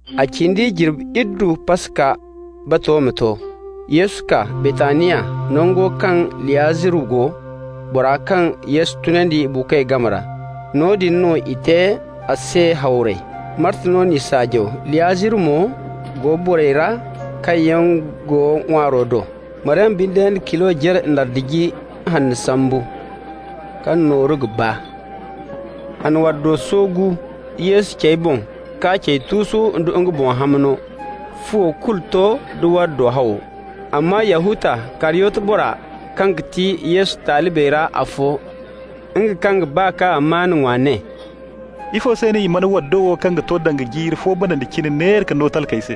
A cindi jirbi iddu Paska bato ma to. Yesu kaa Baytaniya, nango kaŋ Liyaziru go, bora kaŋ Yesu tunandi buukoy game ra. Noodin no i te a se hawray. Marta no n'i saajaw, Liyaziru mo go borey ra kaŋ yaŋ go ŋwaaro do. Maryama binde na kilo jare nardi ji hanno sambu, kaŋ nooru ga baa. A na waddo soogu Yesu cey boŋ k'a cey tuusu nda nga boŋ hamno. Fuwo kulu to nda waddo hawo. Amma Yahuta, Kariyoti bora, kaŋ ga ti Yesu talibey ra afo, nga kaŋ ga ba k'a amaana ŋwa, ne: «Ifo se no i mana waddo wo kaŋ ga to danga jiiri fo banandi cine neera ka no talkey se?»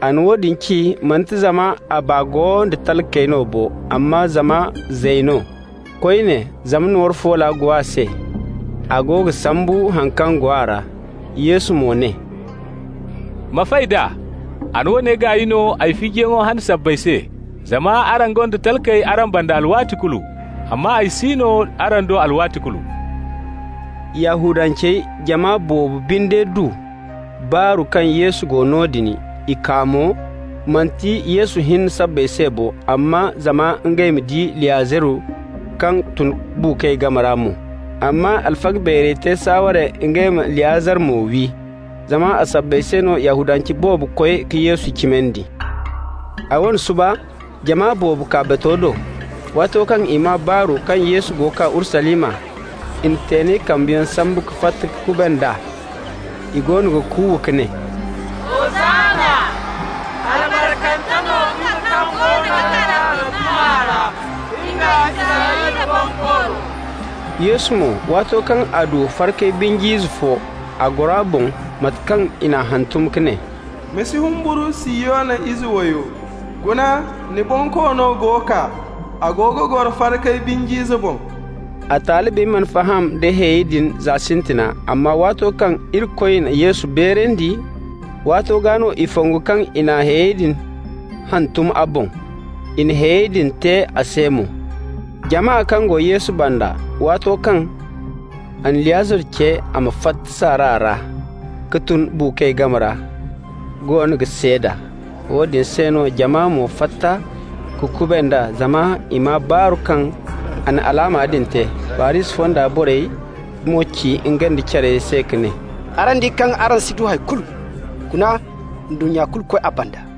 A na woodin ci, manti zama a baa go da talkey no bo, amma zama zay no. Koyne zama nooru foola go a se, a go ga sambu haŋ kaŋ go a ra. Yesu mo ne: «Ma fay d'a. A na woone gaay no ay fijiyaŋo hane sabbay se. Zama araŋ gonda talkey araŋ banda alwaati kulu, amma ay si no araŋ do alwaati kulu.» Yahudancey jama boobo binde du baaru kaŋ Yesu go noodin. I kaa mo, manti Yesu hinne sabbay se bo, amma zama ngey ma di Liyaziru kaŋ a tunandi buukoy game ra mo. Amma alfaga beerey te saaware ngey ma Liyaziru mo wi, zama a sabbay se no Yahudance boobo koy ka Yesu cimandi. A wane suba, jama boobo kaa bato do. Waato kaŋ i maa baaru kaŋ Yesu go kaa Urusalima, i na teenay kambayaŋ sambu ka fatta ka kuband'a. I goono ga kuuwa ka ne: «Hosanna!» «Albarkante no nga kaŋ goono ga kaa Rabbi maa ra, nga Israyla Bonkoono!» Yesu mo, waato kaŋ a du farkay binj'ize fo, a goro a boŋ, mate kaŋ i n'a hantum ka ne: «Ma si humburu, Sihiyona ize wayo. Guna, ni Bonkoono go kaa. A go ga goro farkay binj'ize boŋ.» A talibey mana faham da hayey din za sintina, amma waato kaŋ Irikoy na Yesu beerandi, waato gaa no i fongu kaŋ i na hayey din hantum a boŋ, i na hayey din te a se mo. Jama kaŋ go Yesu banda waato kaŋ a na Liyaziru ce a ma fatta saara ra ka tun buukoy game ra goono ga seeda. Woodin se no jama mo fatta ka kuband'a zama i maa baaru kaŋ a na alaama din te. Farisi fonda borey mo ci ngey nda care se ka ne: «Araŋ di kaŋ araŋ si ga du hay kulu! Guna, ndunnya kulu koy a banda.»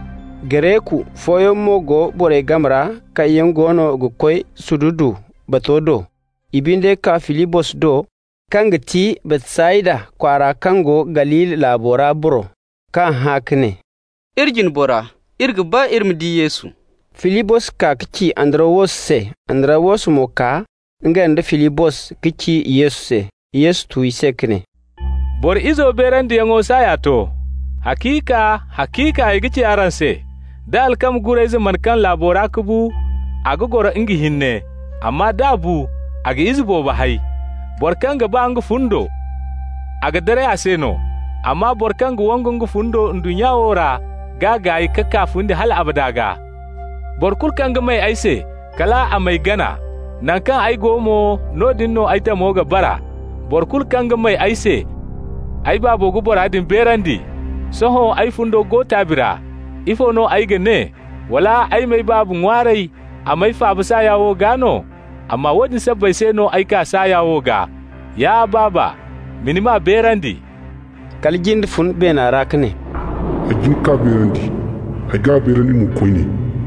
Gareku fooyaŋ mo go borey game ra kaŋ yaŋ goono ga koy ka sududu bato do. I binde kaa Filibos do, kaŋ ga ti Baytsayda kwaara kaŋ go Galili laabo ra boro, k'a hã ka ne: «Iri jine bora, iri ga ba iri ma di Yesu.» Filibos kaa ka ci Andarawos se, Andarawos mo kaa, nga nda Filibos, ka ci Yesu se. Yesu tu i se ka ne: «Boro Izo beerandiyaŋo saaya to. Haciika, haciika ay ga ci araŋ se: da alkama gurayze mana kaŋ laabo ra ka bu, a ga goro nga hinne. Amma d'a bu, a ga ize boobo hay. Boro kaŋ ga ba nga fundo, a ga daray a se no, amma boro kaŋ ga wangu nga fundo ndunnya wo ra g'a gaay ka kaa fundi hal abada gaa. Boro kulu kaŋ ga may ay se, kal a m'ay gana. Naŋ kaŋ ay go mo, noodin no ay tamo ga bara. Boro kulu kaŋ ga may ay se, ay Baabo ga bora din beerandi. Sohõ ay fundo go taabi ra. Ifo no ay ga ne? Wala ay m'ay Baaba ŋwaaray a m'ay faaba saaya wo gaa no? Amma woodin sabbay se no ay kaa saaya wo gaa! Ya Baaba, ma ni maa beerandi!» Kala jinde fun beena ra ka ne: «Ay jin k'a beerandi, ay g'a beerandi mo koyne.»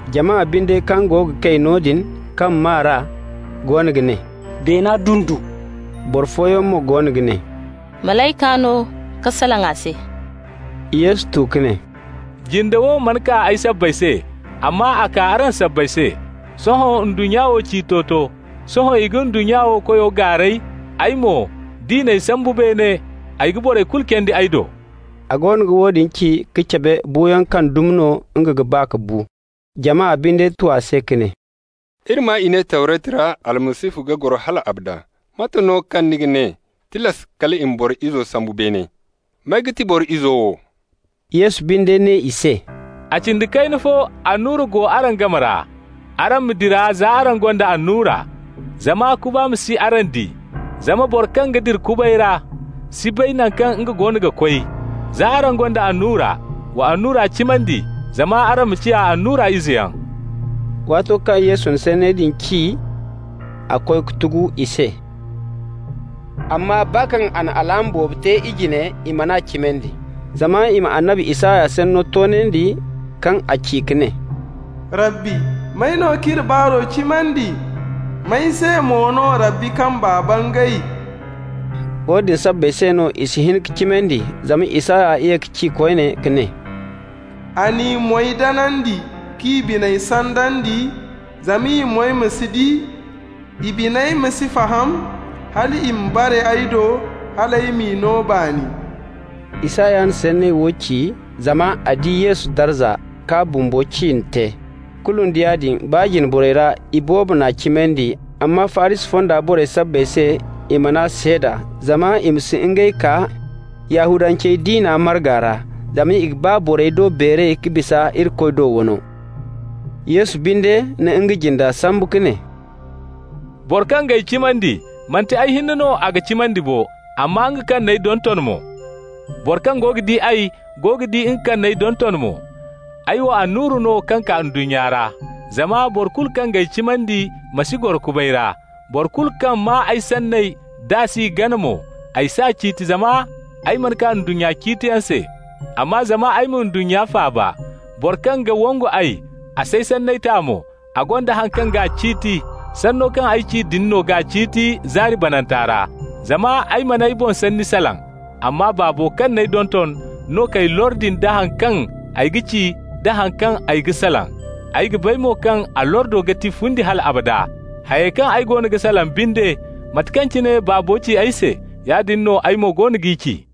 Jama binde kaŋ go ga kay noodin, kaŋ maa r'a, goono ga ne: «Beena dundu.» Boro fooyaŋ mo goono ga ne: «Malayka no ka salaŋ a se.» Yesu tu ka ne: «Jinda wo mana kaa ay sabbay se, amma a kaa araŋ sabbay se. Sohõ ndunnya wo ciito to, sohõ i ga ndunnya wo koyo gaaray. Ay mo, d'i n'ay sambu beene, ay ga borey kulu candi ay do.» A goono ga woodin ci no ka cabe buuyaŋ kaŋ dumi no nga ga ba ka bu. Jama binde tu a se ka ne: «Iri maa i ne Tawretu ra Almasihu ga goro hal abada. Mate no kaŋ ni ga ne: tilas kal i ma Boro Izo sambu beene? May ga ti Boro Izo wo?» Yesu binde ne i se: «A cindi kayna fo annura go araŋ game ra. Araŋ ma dira za araŋ gonda annura, zama kuba ma si araŋ di. Zama boro kaŋ ga dira kubay ra si bay naŋ kaŋ nga goono ga koy. Za araŋ gonda annura, wa annura cimandi, zama araŋ ma ciya annura izeyaŋ.» Waato kaŋ Yesu na sanney din ci, a koy ka tugu i se. Amma baa kaŋ a na alaama boobo te i jine, i man'a cimandi, zama i ma annabi Isaya sanno toonandi, kaŋ a ci ka ne: «Rabbi, may no k'iri baaro cimandi? May se mo no Rabbi kamba bangay?» Woodin sabbay se no i si hin ka cimandi, zama Isaya ye ka ci koyne ka ne: «A n'i moy danandi k'i biney sandandi, zama i moy ma si di, i biney ma si faham hal i ma bare ay do, hal ay m'i no baani.» Isaya na sanney wo ci zama a di Yesu darza k'a bumbo ciine te. Kulu nda yaadin, baa jine borey ra, iboobo n'a cimandi, amma Farisi fonda borey sabbay se i man'a seeda, zama i ma si ngey kaa Yahudance diina marga ra. Zama i ga ba borey do beeray ka bisa Irikoy do wano. Yesu binde na nga jinde sambu ka ne: «Boro kaŋ g'ay cimandi, manti ay hinne no a ga cimandi bo, amma nga kaŋ n'ay donton mo. Boro kaŋ go ga di ay go ga di nga kaŋ n'ay donton mo. Ay wo annura no kaŋ kaa ndunnya ra, zama boro kulu kaŋ g'ay cimandi ma si goro kubay ra. Boro kulu kaŋ maa ay sanney, d'a s'i gana mo, ay s'a ciiti, zama ay mana kaa ndunnya ciitiyaŋ se, amma zama ay ma ndunnya faaba. Boro kaŋ ga wangu ay, a s'ay sanney ta mo, a gonda haŋ kaŋ g'a ciiti: sanno kaŋ ay ci din no g'a ciiti zaari bananta ra. Zama ay mana ay boŋ sanni salaŋ, amma Baabo kaŋ n'ay donton no k'ay lordi nda haŋ kaŋ ay ga ci da haŋ kaŋ ay ga salaŋ. Ay ga bay mo kaŋ a lordo ga ti fundi hal abada. Hayey kaŋ ay goono ga salaŋ binde, mate kaŋ cine Baabo ci ay se, yaadin no ay mo goono g'i ci.»